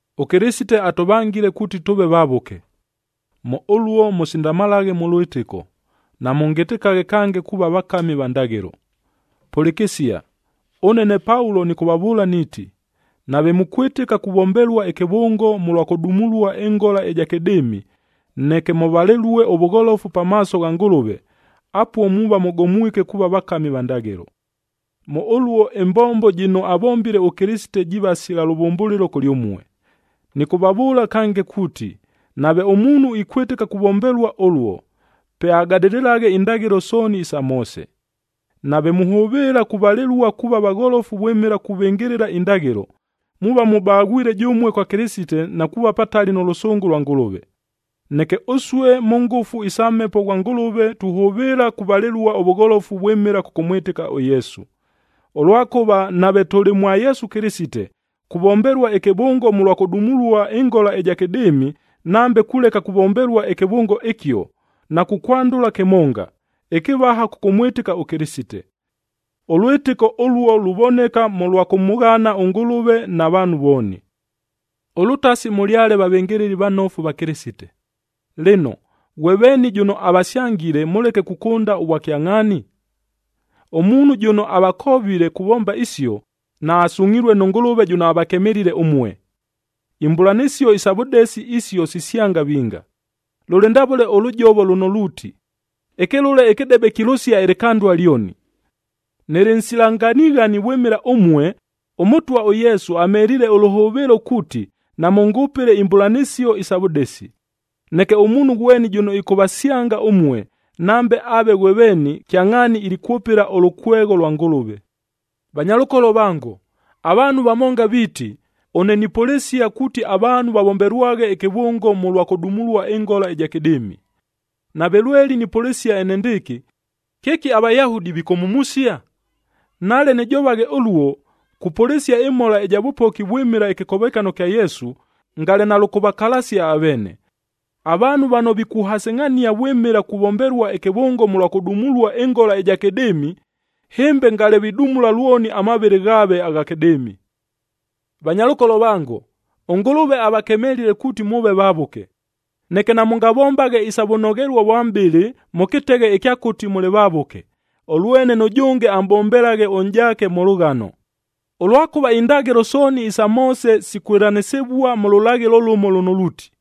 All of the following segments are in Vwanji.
ɄKɨlɨsite atʉvangile kuuti tʉʉve vavʉke. Mʉ ʉluo mʉsindamalaghe mʉ lwɨtɨko, namʉngɨtɨkaghe kange kuuva vakami va ndaghɨlo. Pʉlɨkɨsia! Ʉne ne Paulo nɨkʉvavʉʉla niiti, nave mukwɨtɨka kuvombelua ɨkɨvʉngo mʉlwa kʉdumulua ɨngola ɨja kɨdɨɨmi, neke mʉvalɨlue ʉvʉgholofu pamaaso gha Ngʉlʉve, apuo muuva mʉgomwike kuuva vakami va ndaghɨlo. Mʉ ʉluo ɨmbombo jɨno avombile ʉKɨlɨsite jiiva sila lʉvʉmbʉlɨlo kʉlyʉmue. Nɨkʉvavʉʉla kange kuuti, nave ʉmuunhu ikwɨtɨka kuvombelua ʉluo, pe agadɨlɨlaghe indaghɨlo sooni isa Moose. Nave muhʉvɨɨla kuvalɨlua kuuva vagholofu vwɨmɨla kuvɨngɨlɨla indaghɨlo, muuva mubaghwile jʉmue kwa Kɨlɨsite na kuuva patali nʉ lʉsʉngʉ lwa Ngʉlʉve. Neke ʉsue, mʉ ngʉfu isa Mhepo ghwa Ngʉlʉve tuhʉvɨɨla kuvalɨlua ʉvʉgholofu vwɨmɨla kʉkʉmwɨtɨka ʉYesu. Ʉlwakʉva nave tʉlɨ mwa Yesu Kɨlɨsite, kuvombelua ɨkɨvʉngo mʉlwa kʉdumulua ɨngola ɨja kɨdɨɨmi, nambe kuleka kuvombelua ɨkɨvʉngo ɨkio, nakukwandʉla kɨmonga, ɨkɨvaha kʉkʉmwɨtɨka ʉKɨlɨsite. Ʉlwɨtɨko ʉluo luvoneka mʉlwa kʉmʉghana ʉNgʉlʉve na vaanhu vooni. Ʉlʉtasi mʉlyale vavɨngɨlɨli vanofu va Kɨlɨsite! Lɨno, ghwe veeni jʉno avasyangile mʉleke kukʉnda ʉvwakyangʼhaani? Ʉmuunhu jʉno avakovile kuvomba isio, naasungʼhilue nʉ Ngʉlʉve jʉno avakemelile ʉmue. Imbʉlanɨsio isa vʉdesi isio sisyanga vinga, lʉlɨ ndavʉle ʉlʉjovo lʉno luuti, “Ɨkɨlʉle ɨkɨdebe kilʉsia ɨlɨkandua lyoni.” Nɨlɨ nsila nganighani vwɨmɨla ʉmue, ʉMʉtwa ʉYesu amheliile ʉlʉhʉvɨɨlo kuuti namʉngʉpɨle imbʉlanɨsio isa vʉdesi. Neke ʉmuunhu ghweni jʉno ɨkʉvasyanga ʉmue, nambe aave ghwe veeni, kyangʼhaani ilikwʉpɨla ʉlʉkwegho lwa Ngʉlʉve. Vanyalʉkolo vango, avaanhu vamonga viiti, ʉne nipʉlɨsia kuuti avaanhu vavombelwaghe ɨkɨvʉngo mʉlwa kʉdumulua ɨngola ɨja kɨdɨɨmi. Nave lweli nipʉlɨsia enendɨɨkɨ, kɨki aVayahudi vikʉmhumusia? Nale nɨjovaghe ʉluo, kupʉlɨsia ɨmhola ɨja vʉpoki vwɨmɨla ɨkɨkovekano kya Yesu, ngale nalʉkʉvakalasia aveene. Avaanhu vano vikʉvahasɨngʼhania vwɨmɨla kuvombelua ɨkɨvʉngo mʉlwa kʉdumulua ɨngola ɨja kɨdɨɨmi, hɨmbe ngale vidumula lwoni amavɨlɨ ghaave agha kɨdɨɨmi. Vanyalʉkolo vango, ʉNgʉlʉve avakemelile kuuti mʉʉve vavʉke. Neke namʉngavombaghe isa vʉnoghelua vwa mʼbɨlɨ mʉ kɨteghe ɨkya kuuti mʉlɨ vavʉke, ʉlwene nʉjʉnge amʼbombelaghe ʉnʼjaake mʉ lʉghano. Ʉlwakʉva indaghɨlo sooni isa Moose sikwɨlanɨsɨvua mʉ lʉlaghɨlo lʉmo lʉno luuti,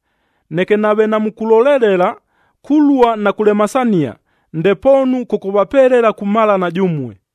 Neke nave namukulolelela, kulua na kulemasania, ndepoonu kʉkʉvapelela kumalana jʉmue.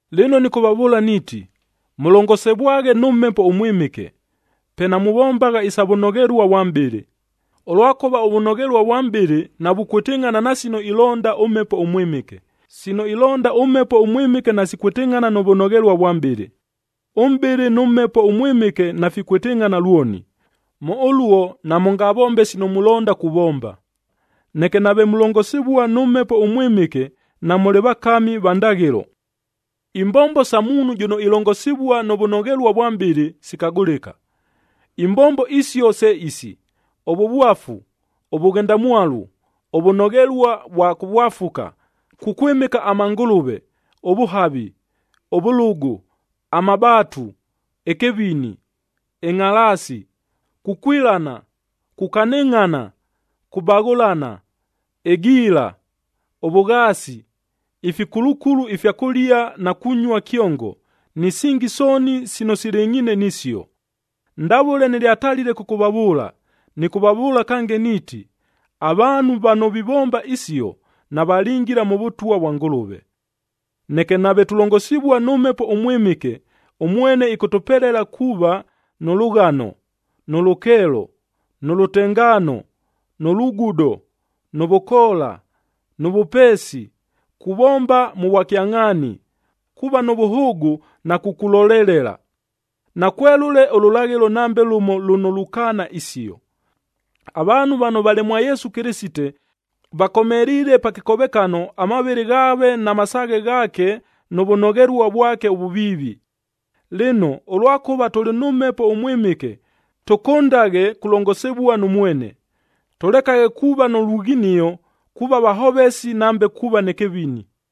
Lɨno nɨkʉvavʉʉla niiti, mʉlongosivwaghe nʉ Mhepo ʉMwɨmɨke, pe namuvombagha isa vʉnoghelua vwa mʼbɨlɨ. Ʉlwakʉva ʉvʉnoghelua vwa mʼbɨlɨ navukwɨtɨngʼhana na sino ilonda ʉMhepo ʉMwɨmɨke, sino ilonda ʉMhepo ʉMwɨmɨke nasikwɨtɨngʼhana nʉ vʉnoghelua vwa mʼbɨlɨ. Ʉmʼbɨlɨ nʉ Mhepo ʉMwɨmɨke nafikwɨtɨngʼhana lwoni. Mʉ ʉluo namʉngavombe sino mulonda kuvomba. Neke nave mulongosivua nʉ Mhepo ʉMwɨmɨke, namʉlɨ vakami va ndaghɨlo. Imbombo sa muunhu jʉno ilongosivua nʉ vʉnoghelua vwa mʼbɨlɨ, sikagʉlɨka. Imbombo isio se isi: ʉvʉvwafu, ʉvʉghendamwalu, ʉvʉnoghelua vwa kʉvwafuka, kukwɨmɨka amangʉlʉve, ʉvʉhavi, ʉvʉlʉgʉ, amabaatu, ɨkɨvini, ɨngʼhalaasi, kukwilana, kukanɨngʼhana, kubaghʉlana, ɨgiila, ʉvʉghaasi, ifikulukulu ifya kʉlia na kunyua kyongo, ni singi sooni sino silɨngʼhiine nisio. Ndavʉle nɨlyatalile kʉkʉvavʉʉla, nɨkʉvavʉʉla kange niiti, avaanhu vano vivomba isio, navalingila mʉ Vʉtwa vwa Ngʉlʉve. Neke nave tulongosivua nʉ Mhepo ʉMwɨmɨke, ʉmwene ɨkʉtʉpelela kuuva: nʉ lʉghano, nʉ lʉkeelo, nʉ lʉtengaano, nʉ lugudo, nʉ vʉkoola, nʉ vʉpeesi, kuvomba mʉ vwakyangʼhaani, kuuva nʉ vʉhʉʉgʉ na kukulolelela. Nakwelʉle ʉlʉlaghɨlo nambe lʉmo lʉno lukaana isio. Avaanhu vano valɨ mwa Yesu Kɨlɨsite, vakomeliile pa kɨkovekano amavɨlɨ ghaave na masaaghe ghaake nʉ vʉnoghelua vwake ʉvʉviivi. Lɨno, ʉlwakʉva tʉlɨ nʉ Mhepo ʉMwɨmɨke, tʉkʉndaghe kulongosivua nʉ mwene. Tʉlekaghe kuuva nʉ lughinio, kuuva vahovesi nambe kuuva nɨ kɨvini.